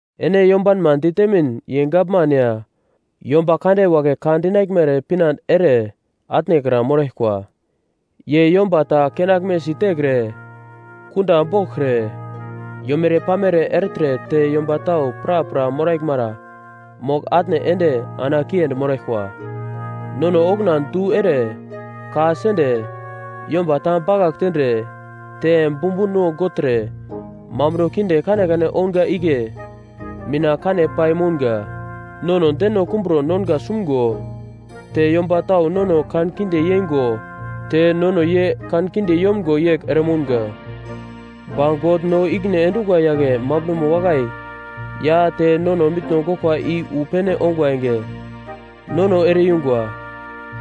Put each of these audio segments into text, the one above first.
Ene yombanma ditemin ye gavman ya yomba kande wagle ka dinaglmere pinande ere atnekra moraglkwa. Ye yomba ta kenaglme sitekre, kunda boglkre, yomere-pamere ertre te yomba tau prapra moraglmara mogl-atne ende ana kiendi moraglkwa. Nono okuna du ere, ka sende, yomba ta bakagl tendre te bumbuno gogltre mambuno kinde kanekane ounga igle mina kane pai mounga. Nono deno kumburo nonga sumgo te yomba tau nono kankinde yeingo te nono ye kankinde yomgo yegl eremounga. Ba God no ikine endungwa yagle mambunomo wakai ya te nono mitno goglkwa i wu pene ongwa enge, nono ere-yungwa.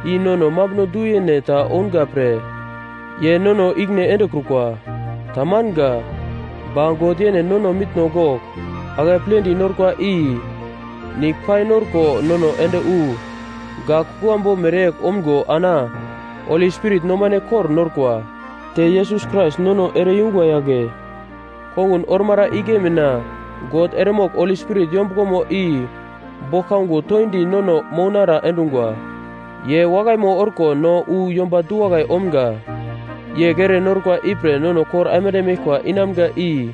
I nono mambuno du-yene ta ounga pre ye nono ikine endekrukwa, tamanga. Ba God yene nono mitno gogl akepledi norkwa i nigl pai norko nono ende wu gak kuglambu mereyegl omgo ana Holi Spirit nomane kor norkwa. Te Yesus Krais nono ere-yungwa yagle kongun ormara igle mina God eremogl Holi Spirit yombuglomo i boglkango toindi nono mounara endungwa. Ye wakaimo orko no wu yomba du-wakai omga. Yegl ere norkwa ipre nono kor aimande meglkwa inamga i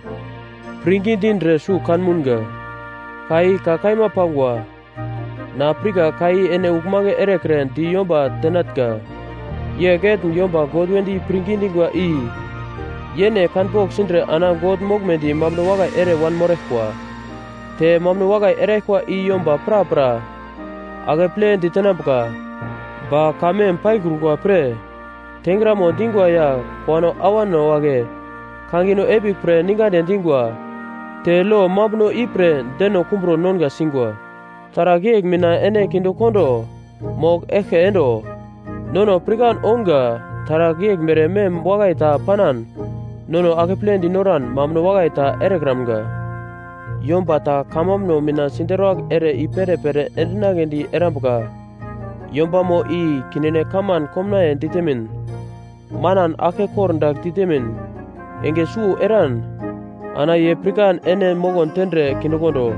pirngi dindre sugl kanmunga. Ka i ka kaima pangwa. Na pirka ka i ene uglmange erekre di yomba tenatnga. Yegl etn yomba God wedi pirngi dingwa i yene kanpogl sindre ana God moglmedi mambuno wakai ere wanmoraglkwa. Te mambuno wakai eraglkwa i yomba prapra akeple ditenambuka. Ba ka mem paikrukwa pre tengramo dingwa ya kowano awano wagle kangino epigl pre ningadi dingwa, te lo mambuno ipre deno kumburo nonga singwa. Taragl yegl mina ene kindekondo mogl eglke endo. Nono pirkan ounga taragl yeglmere mem wakai ta panan nono akeple dinoran mambuno wakai ta erekramga. Yomba ta kamambuno mina siderwagl ere i-perepere endinagledi erambuka yombamo i kindine kaman komnaiye ditemin manan aglke kordagl ditemin enge suwo eran ana ye pirkran ene mokon tendre kindekondo.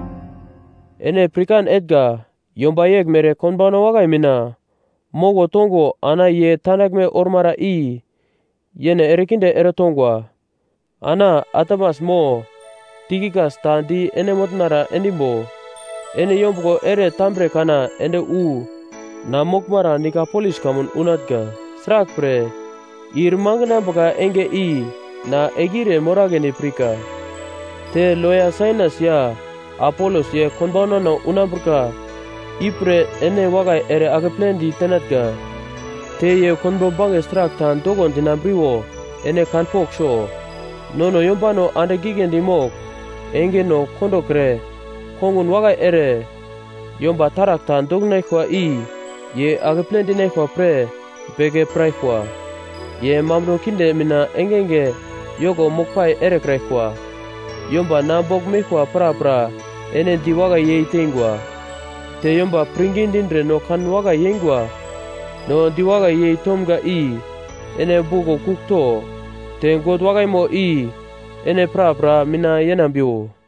Ene pirkan etnga yomba yeglmere konbauna wakai mina moko tongo, ana ye tandaglme ormara i yene erekinde eretongwa. Ana Atemas mo Tikikas ta di ene motnara endimbo, ene yombuglo ere tambre kana ende wu na moglmara Nikapolis kamun unatnga, sraglpre, ir mangenambuka enge i na eglire moragledi pirka. Te loya Sinas ya Apolos ye konbaunano unambrika ipre ene wakai ere akepledi tenatnga, te ye konbo bange sragl ta doko dinambriwo ene kanpogl suo. Nono yombano andigl giglendi mogl engeno kondokre kongun wakai ere, yomba taragl ta doknaglkwa i ye akeple dinaglkwa pre beke piraglkwa. Ye mambuno kinde mina engenge yoko moglpai erekraglkwa. Yomba na bogl meglkwa prapra ene diwakai yei teingwa. Te yomba pirngi dindre no kan wakai yengwa no diwakai yei tomga i ene boglo kugl to, te God wakaimo i ene prapra mina yenambiwo.